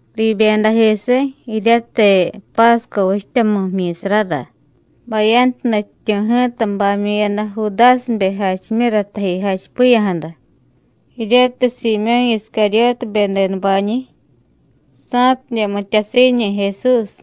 Riibyedajisiy jiryatiy Pásco vichtyamu jmyi̱sarara, bayantu nutyityu̱ ji̱ta bamyu̱yada Judásibe jachimyura taji jachipiya̱jada, jiryatiy Siimyó̱ Iscaryótibe denubañi̱, sa̱tidye mityasiiñi̱ Jesús.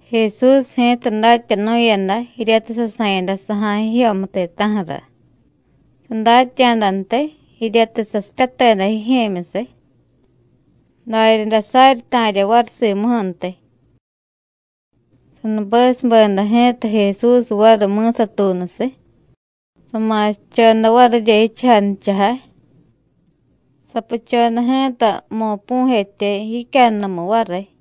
Jesús ji̱ta datyanu̱yada jiryatiy sasa̱yada saja̱y jijyomu ti̱ta̱ju̱ra. Sadatya̱dantiy jiryatiy sasipyateda jijye̱myusiy, daryaday saryi ta̱rya variy simuju̱ntiy. Sanubesubeda ji̱ta Jesús variy mi̱satuunusiy, sama̱sichoda varirya jichujay nichajay. Sapuchoda ji̱ta mo̱pu̱jetya jicyannumu variy.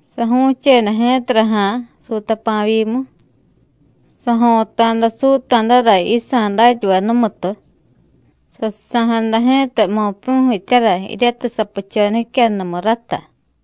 Saju̱cheda ji̱tara ja̱a̱ suutapa̱vyimu, sajo̱ta̱da suuta̱dara yisa̱ datyavay numutu, sasusa̱jada ji̱ta mo̱pu̱jetyara jiryatiy sapuchoda jicyannumu rata.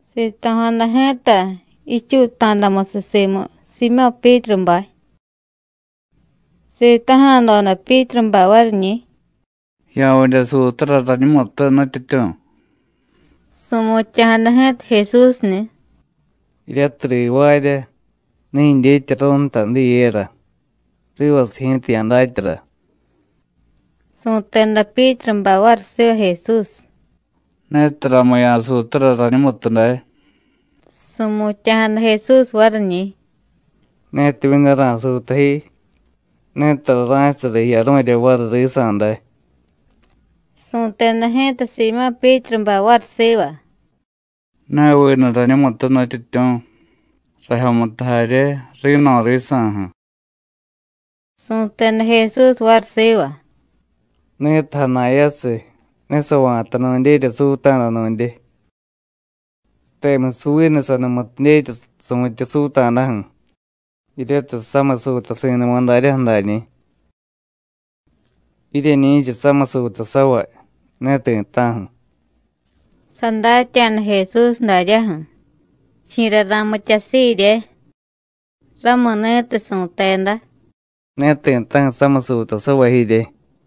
Sito̱jada ji̱ta jichuuta̱damusiy simu Siimyó̱ Pyítrubay. Sitaja̱doda Pyítrubay variñi̱: “¿Ya̱vidye suutara rañumutu, Nutyityu̱?” Su̱mutya̱jada ji̱ta Jesúsni̱: “Jiryatiy rivaarya, ne jidyetyaru̱y nta diyera. Rivasiy ji̱ta ya̱datyara.” Su̱teda Pyítrubay variy siva Jesús: “Netaramu ya̱suutara rañumutu day.” Su̱mutya̱jada Jesús variñi̱: “Netimyu̱ ne ra̱suuta ji, ne tara ra̱chasara jiyaru̱rya variy risa̱ day.” Su̱teda ji̱ta Siimyó̱ Pyítrubay variy siva: “Ne vinu rañumutu, Nutyityu̱, rajyomutu jarye, ri̱no̱ risa̱ju̱.” Su̱teda Jesús variy siva: “Ni̱tiy jana̱yasiy, ne sava̱ta nu̱ndyerya suuta̱da nu̱ndye, temusiy vinu sanumutu dyetya su̱tye suuta̱daju̱, jiryatiy samiy suutasi̱numa daryaju̱ dañi̱. Jiryeñi̱cha samiy suutasavay, ne ti̱ta̱ju̱.” Sadatya̱da Jesús daryaju̱: Chi̱ra ra̱mityasiirye. Ramuni̱tiy su̱teda: “Ne ti̱ta̱ju̱ samiy suutasavay jirye.”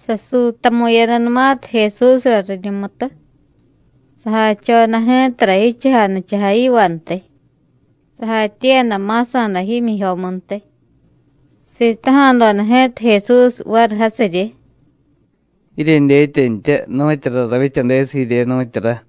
Sasuutamu̱yadanumatiy Jesúsra riñumutu, sajachoda ji̱tara jichujay nichajay yivantiy, sajatyiiyada ma̱sa̱da jmyijyomuntiy. Sitaja̱doda ji̱ta Jesús variy jasiryi: “¿Jiryedyetyantya nu̱tyura ravyichadesiy jirye, nu̱tyura?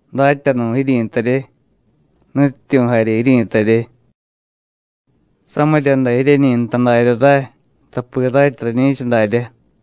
Datyanu̱ jiryi̱tarye, Nutyityu̱ jarye jiryi̱tarye. Samirya day jiryeñi nta darya ray, tapi ratya rañi̱cha daryá.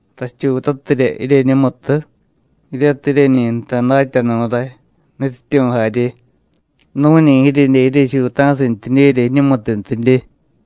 Rachuutatirya jiryeñumutu, jiryatiy jiryeñi jtay Datyanu̱ ray, Nutyityu̱ jarye, nu̱ñi jiryedye jiryechuuta̱sintyidyerya jiñumutuntidye.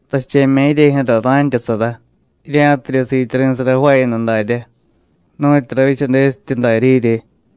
Rache̱mya̱ jiryejyu̱ra ra̱ntyasara, jirya̱tidye siityari̱sara jvaayada daryá, nu̱tyu ravyichadesityi darya jirye.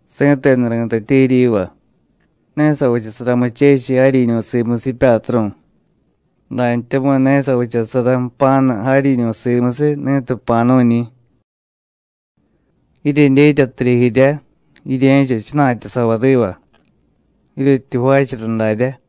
Si̱tenu ri̱tatye jiryiva: Ne savichasara muchechiy jaryiñu̱ simusiy jipyatru̱, dantyamu̱y ne savichasara jpa̱nu jaryiñu̱ simusiy ni̱tiy jpa̱nu̱ñi̱. Jiryedyetyatirya jirya, jirye̱cha jchana̱tyasavay riva, jiryetyi jvaachara daryá.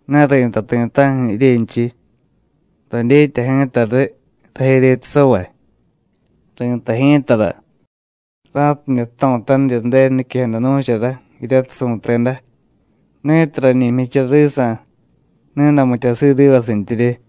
Ne ri̱tay ti̱ta̱ju̱ jiryenchiy. Radyetya ji̱ta riy rajeryetasavay. Ri̱tay ji̱tara, ra̱tidye jto̱tanirya Ju̱denu niquejada nu̱chara jiryatiy su̱teda: Ni̱tiy rañi jmyichara risa̱, ni̱day mityasiiy rivasintyirye.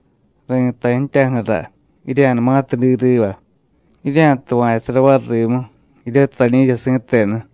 Ri̱tay ji̱tyaju̱ra, jirya̱numatiy diy riva, jirya̱tuva̱chusara variy rimu, jiryatiy rañi rañi̱cha si̱tenu.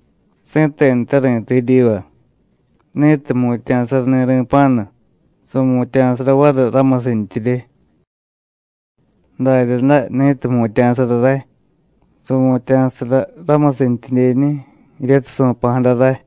Si̱tenute ri̱tay jiryiva: Ni̱tiy jmutya̱sarani̱ ri̱pa̱nu, su̱mutya̱sara variy ramusintyirye. Daryaday ni̱tiy jmutya̱sara ray, su̱mutya̱sara ramusintyidyeñi̱ jiryatiy su̱pa̱jada ray.”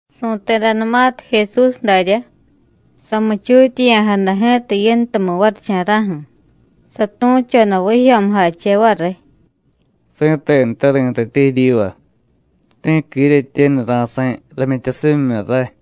Su̱tedanumatiy Jesús daryá, samuchutyeya̱jada ji̱ta yintumu varicha̱ra̱ju̱, satu̱choda vijyo̱mujache variy: “Si̱tenute ri̱tatye jiryiva: Ti̱qui jiryetyenu ra̱sa̱y ramyityasimyimyu ray.”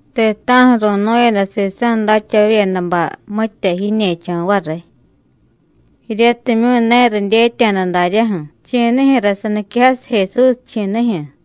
Ti̱ta̱ju̱ ru̱nu̱yada sisa̱ datyavavyedabay mitya jiñe̱cho̱ variy, jiryatimyu̱ ne ridyetya̱da daryaju̱ chi̱nijyu̱ra saniquejasiy Jesús, chi̱nijyu̱.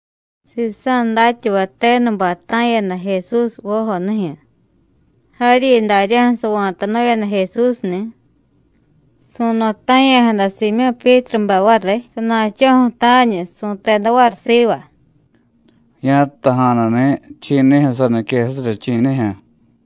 Sisa̱ datyavay tenubay ta̱yada Jesús vojonijyu̱. Jaryi daryaju̱ sava̱tanu̱yada Jesúsni̱. Su̱no̱ta̱ya̱jada Siimyó̱ Pyítrubay variy sana̱cho̱ju̱ ta̱ñu, su̱teda variy siva: “Ya̱jtaja̱nuni̱ chi̱nijyu̱ saniquejasirya, chi̱nijyu̱.”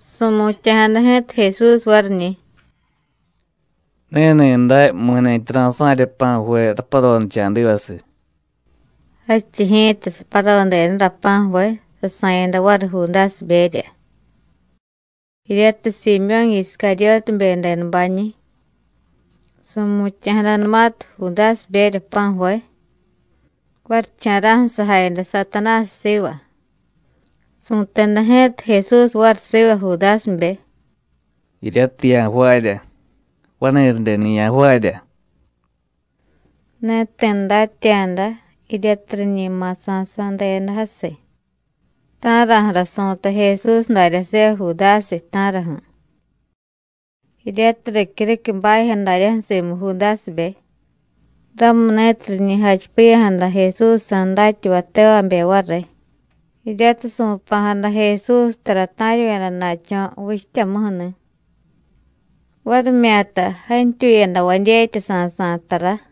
Su̱mutya̱jada ji̱ta Jesús variñi̱: “Ni̱ni̱day mi̱ni̱tyi ra̱sa̱rya pa̱ju̱ve raparonicha̱divasiy.” Jadchiy ji̱ta saparodedara pa̱ju̱ve, sasa̱yada variy Judásiberya, jiryatiy Siimyó̱ Iscaryótibe denubañi̱. Su̱mutya̱jadanumatiy Judásiberya pa̱ju̱ve, varicha̱ra̱ju̱ sajayada Satanásiy siva. Su̱teda ji̱ta Jesús variy siva Judásibe: “Jiryatiy ya̱jvaarya, vani̱radeni̱ ya̱jvaarya.” Ne ti̱ datya̱da jiryatiy riñi ma̱sa̱sá̱deda jasiy: ta̱raju̱ra su̱tay Jesús darya siva Judásiy, ta̱raju̱. Jiryatiy ricyuriquiy bajyo daryaju̱ simu Judásibe, ramuni̱tiy riñi jachipiya̱jada Jesúsjsa̱ datyavay tevabe variy jiryatiy su̱pa̱jada Jesús tara ta̱ryu̱yada na̱cho̱ vichtyamuju̱ni̱, varimyata jantyuyadavay dyetya sa̱sa̱y tara.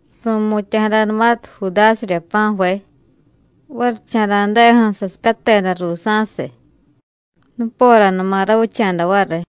Su̱mutya̱jadanumatiy Judásirya pa̱ju̱ve, varicha̱ra̱deju̱ sasipyateda ruusa̱siy. Nuporanuma ravicha̱da variy.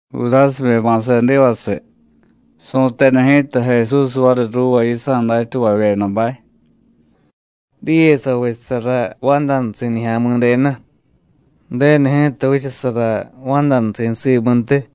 Judásibe ma̱sedivasiy, su̱teda ji̱ta Jesús variy ruuva yisa̱ datyavavyedabay: “Diye savichasara vandanusi̱ Nijya̱mi̱denu, Ju̱denu ji̱ta vichasara vandanusi̱ simuntiy.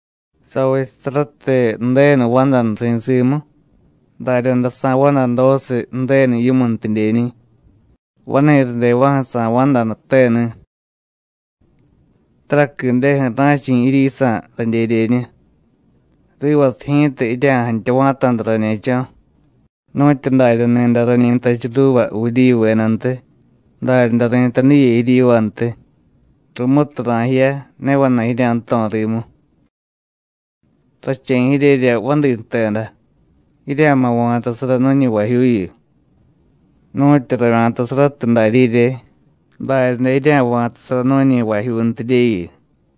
Savichasaratiy Ju̱denu vandanusi̱ simu, daryaday sa̱vandadosiy Ju̱denu yimuntidyeñi̱, vani̱radeva̱ju̱ sa̱vandanuteni̱. Taraquideju̱ ra̱chi̱ jiryisa̱, radyedyeñu. Rivasiy ji̱ta jirya̱jantya va̱ta̱da rañe̱cho̱. Nu̱tyu darya ni̱day rañi jtachiy ruuva Judíyuvedantiy, daryaday ri̱tay diye jiryivantiy: Rumutiy ra̱jiya, ne vana̱y jirya̱jto̱ rimu. Rache̱ jiryerya vadi jteda: Jirya̱ma̱ va̱tasara nu̱ñi vajyuuyu. Nu̱tyu ravya̱tasaratiy darya jirye, daryaday jirya̱va̱tasara nu̱ñi vajyuuntidyeyu.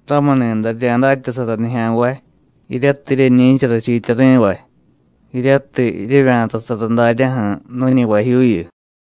Ramuni̱day rirya̱datyasara nijya̱nvay jiryatiy jiryeñi̱cha rachiityari̱vay, jiryatiy jiryevya̱tasara daryaju̱ nu̱ñi vajyuuyu.”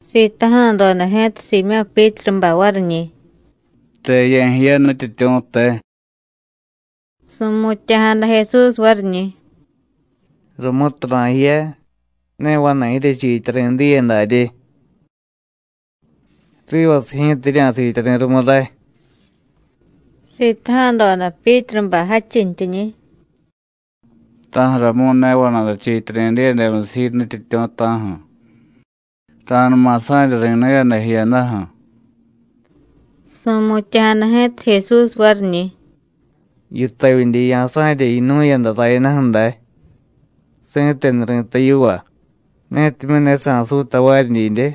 Sitaja̱doda ji̱ta Siimyó̱ Pyítrubay variñi̱: “¿Te ye̱jiya, Nutyityu̱, te?” Su̱mutya̱jada Jesús variñi̱: “Rumutiy ra̱jiya, ne vana̱y jiryechiityari̱ diye darye. Rivasiy ji̱ta jirya̱siityari̱ rumu ray.” Sitaja̱doda Pyítrubay jadchintyiñi̱: “¿Ta̱ju̱ramu̱y ne vana̱y rachiityari̱ diyemusiy ji, Nutyityu̱, ta̱ju̱? Ra̱numa sa̱rya ri̱nu̱yada jiyadaju̱.” Su̱mutya̱jada ji̱ta Jesús variñi̱: “¿Yitavyidye ya̱sa̱rya yinu̱yada rayadaju̱ day? Si̱tenu ri̱tay yiva: Netimyu̱ ne sa̱suy tavaryi didye,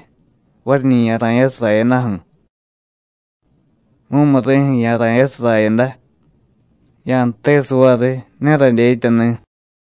variñi̱ ya̱ra̱yasiy rayadaju̱. Mumuri̱ju̱ ya̱ra̱yasiy rayada. Ya̱jtesiy variy: Ne radyetyani̱.”